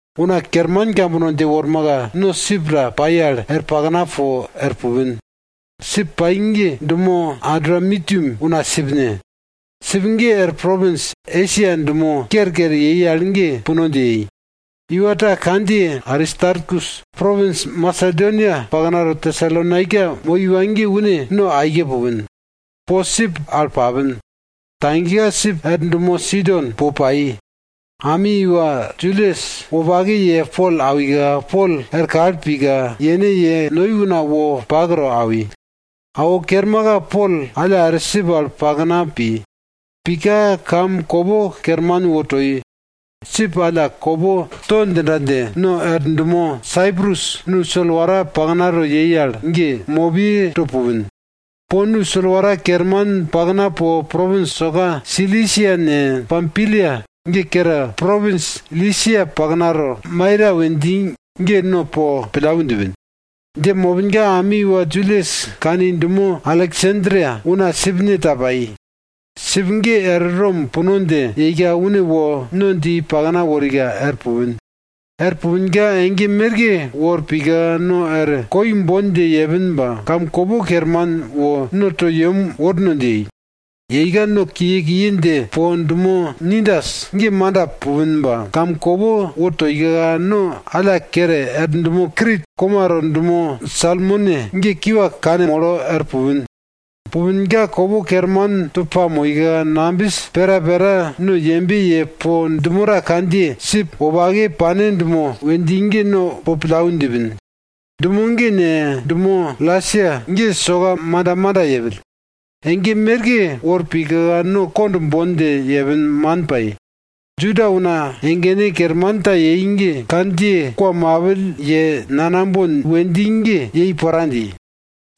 Una kerman kambono dje wormaka, no sip ta pai al er pakna po er pupin. Sip pai ge dumo Adramitium una sipne. Sip ge er propins Esia dumo kerker yei al ge puno dje yei. Iwa ta kandjiye Aristarkus propins Masedonia paknato Tesalonaika moi iwa ge une no aike pupin. Po sip al papin. Tagika sip er dumo Sidon po pai. Ami iwa Julius wopake ye Pol awika, Pol er kal pika, yene ye noi una wo pak to awi. Awo kermaka Pol alla er sip al pakna pi. Pika, kamkopo kerman wo toi. Sip alla kopo to djinda dje, no er dumo Saiprus nu solwara paknato yei al ge, mopiyeto pupin. Po nu solwara kerman pakna po propins soka Silisia ne, Pampilia ge kere, propins Lisia paknato Maira we dji ge no po pillau djipin. Dje mopinka ami iwa Julius kani dumo Aleksandria una sipne ta pai. Sip ge er Rom puno dje yeika une wo no dje i pakna worika er pupin. Er pupinka ege merke wor pika no er koi bon dje yepin ba kamkopo kerman wo no to yem worno dje yei. Yeika no kiye kiye dje po, dumo Nidus ge manda pupin ba, kamkopo wo toika, no alla kere er dumo Krit komato dumo Salmone ge kiwa kanmolo er pupin. Pupinka kopo kerman to pamoika, nambis pera pera no yembe ye po dumo ta kandjiye sip wopake pane dumo we dji ge no po pillau djipin. Dumo ge ne, dumo Lasea ge soka manda manda yepill. Ege merke wor pika, no kond bon dje yepin, man pai. Juda una egene kerman ta yei ge kandjiye kwa mapill ye nanambon we dji ge yei pora dji.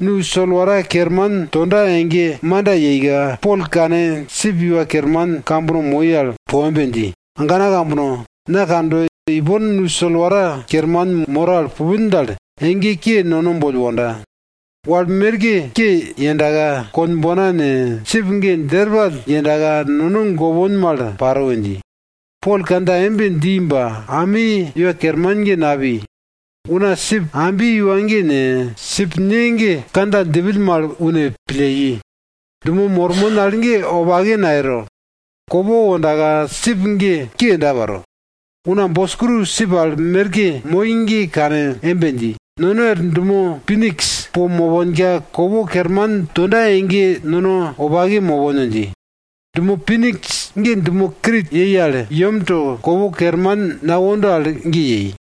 Nu solwara kerman tonda ege manda yeika, Pol kane sip iwa kerman kambono moi al po embe dji, agana kambono, na kando ipon nu solwara kerman moro al pupin dal, ege ke nono boll wonda. Wal merke ke yendaka, konbona ne, sip ge djerpall yendaka, nono gopon mal paro we dji. Pol kandja embe dji ba ami iwa kerman ge napi. Una sip ambi iwa ge ne, sip ne ge kandja djipill mal une pille i. Dumo mormon al ge wopake nayero. Kopo wondaka sip ge ke yenda paro. Una boskru sip al merke moi ge kane embe dji, nono er dumo Piniks po moponka, kopo kerman tonda ege nono wopake mopon we dji. Dumo Piniks ge dumo Krit yei al yemto kopo kerman nawonda al ge yei.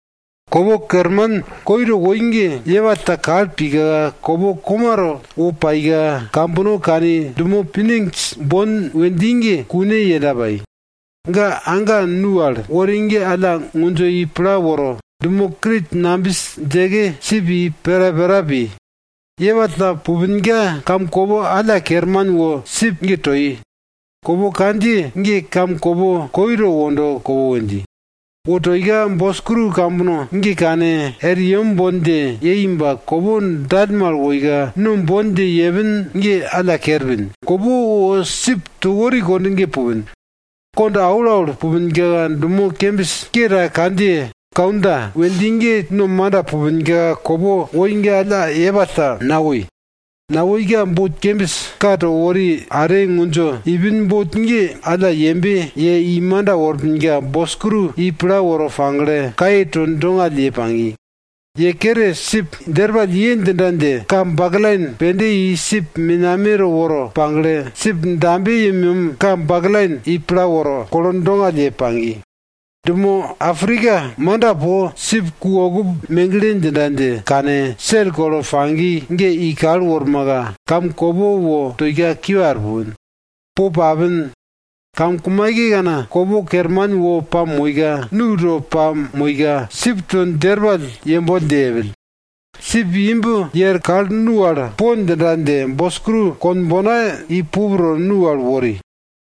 Kopo kerman koito woi ge, yepall ta kal pika, kopo komato wo paika kambono kani dumo Piniks bon we dji ge, kune yenda pai. Ga anka nu al wori ge alla ngundjo i pla woro, dumo Krit nambis djeke sip i pera pera pi. Yepall ta pupinka, kamkopo alla kerman wo sip ge toi. Kopo kandjiye ge kamkopo koi to wondo kopo we dji. Wo toika, boskru kambono ge kane, er yem bon dje yei ba kopo dallmal woika, no bon dje yepin ge alla kerpin, kopo wo sip to wori kond ge pupin. Kond aulaul pupinka, dumo kembis ke ta kandjiye Kauda we dji ge no manda pupinka kopo woi ge alla yepall ta nawoi. Nawoika, bot kembis ka to wori are ngundjo iupin bot ge alla yembe ye i manda worpinka, boskru i pla woro pagle, kaye to dongall ye pagi. Ye kere sip djerpall ye djinda dje, ka baklain pende i sip menameto woro pagle, sip dambe yemyem ka baklain i pla woro, kolo dongall ye pagi. Dumo Aprika manda po, sip ku okup megle djinda dje kane, sel kolo pagi ge i kal wormaka, kamkopo wo toika kiwa er pupin. Po papin. Kamkumaikekana, kopo kerman wo pamoika, nu to pamoika, sip to djerpall yemboll dje yepill, sip imb ye er kal nu al po djinda dje boskru konbona i pup to nu al wori.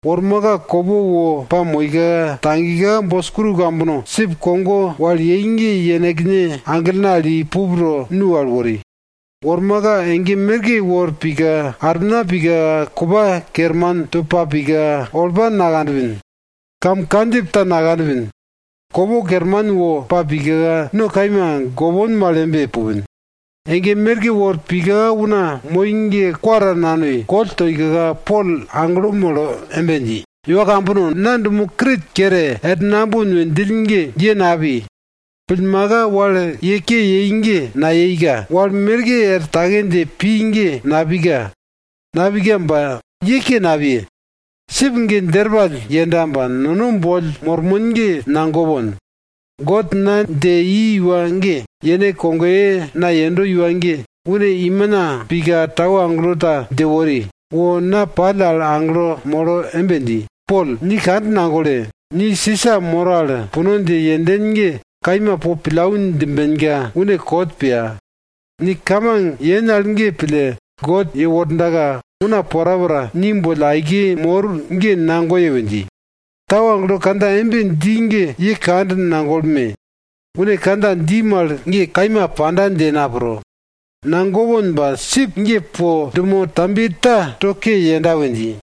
Wormaka kopo wo pamoika, tagika, boskru kambono sip kogo wal yei ge yenekne aglene al i pup to nu al wori. Wormaka ege merke wor pika, armina pika kupa kerman to pa pika, olpa nakanpin, kam kandjip ta nakanpin. Kopo kerman wo pa pika, no kaima gopon mal embe pupin. Ege merke wor pika una moi ge kwa ta nanoi, koll toika, Pol aglo molo embe dji, iwa kambono! Na dumo Krit kere er nambon we djill ge ye napi. Pillmaka, wal ye ke yei ge nayeika, wal merke er take dje pi ge napika. Napika ba ye ke napiye. Sip ge djerpall yenda ba, nono boll mormon ge nagopon. God na dje i iwa ge, yene kogoye na yendo iwa ge, une imina pika tau agelo ta dje wori, wo na pall al aglo molo embe dji, Pol, ni kand nagole! Ni Sisa moro al puno dje yenden ge kaima po pillau djimbenka une kot piya. Ni kamang yen al ge pille, God yewordaka una porapora ni boll aike mor ge nagoye we dji. Tau agelo kandja embe dji ge, ye kand nagolme! Une kandja dji mal ge kaima panda dje na pro. Nagopon ba sip ge po dumo tambiye ta to ke yenda we dji.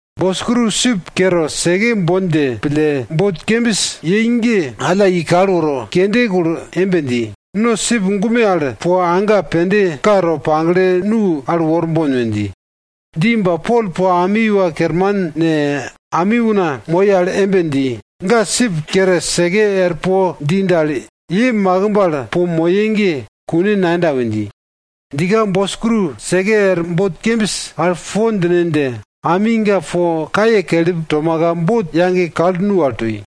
Boskru sip kere seke bon dje pille, bot kembis yei ge alla i kal woro, kende kulo embe dji, no sip gume al po anka pende ka to pagle nu al worbon we dji. Dji ba Pol po ami iwa kerman ne, ami una moi al embe dji, ga sip kere seke er po dji dal, ye makimb al po moye ge kune nayenda we dji. Djika boskru seke er bot kembis al po djine dje, ami ga po kaye kelip tomaka, bot yage kal nu al toi.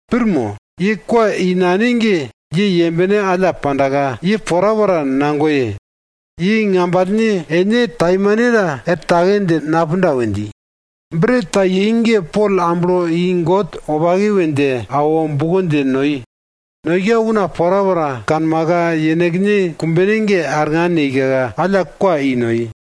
Pir mo? Ye kwa i nane ge ye yembene alla pandaka, ye porapora nagoye. Ye ngambalne ene taimanta er take dje napunda we dji. Bret ta yei ge Pol amblo i God wopake we dje awo, buko dje noi. Noika una porapora kanmaka, yenekne kumbene ge arngan yeika, alla kwa i noi.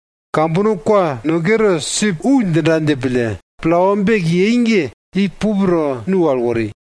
Kambono kwa no kere, sip wu djinda dje pille, plawa bek yei ge i pup to nu al wori.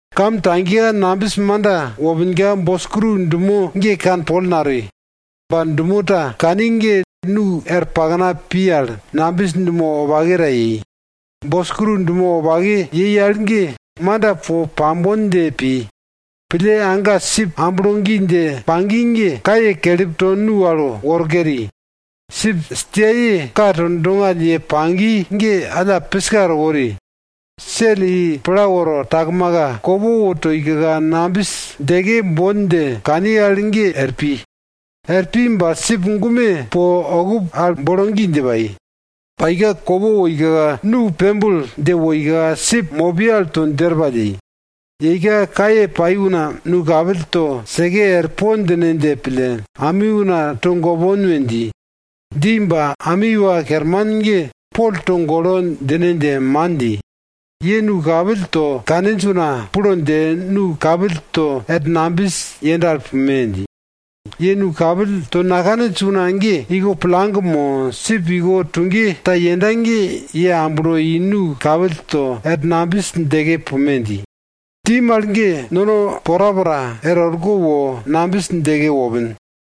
Kam tagika nambis manda wopinka, boskru dumo ge kanpol natoi. Ba dumo ta kani ge nu er pakna pi al nambis dumo wopake ta yei. Boskru dumo wopake yei al ge manda po pambon dje pi. Pille anka sip amblo gi dje pagi ge, kaye kelip to nu al woro keri. Sip stiaye ka to dongall ye pagi ge, alla piska to wori. Sel i pla woro takmaka, kopo wo toika, nambis djeke bon dje kani al ge er pi. Er pi ba sip gume po okup al bolo gi dje pai. Paika, kopo woika, nu pembul dje woika sip mopiye al to djerpall yei. Yeika kaye pai una nu kapill to seke er po djine dje pille, ami una togopon we dji. Dji ba, ami iwa kerman ge Pol togolo djine dje man dji, ye nu kapill to kaninj una plo dje nu kapill to er nambis yenda al pume! dji. Ye nu kapill to nakaninj una ge iko plang mo, sip iko tuge ta yenda ge ye amblo i nu kapill to er nambis djeke pume! dji. Dji mal ge nono porapora er orko wo nambis djeke wopin.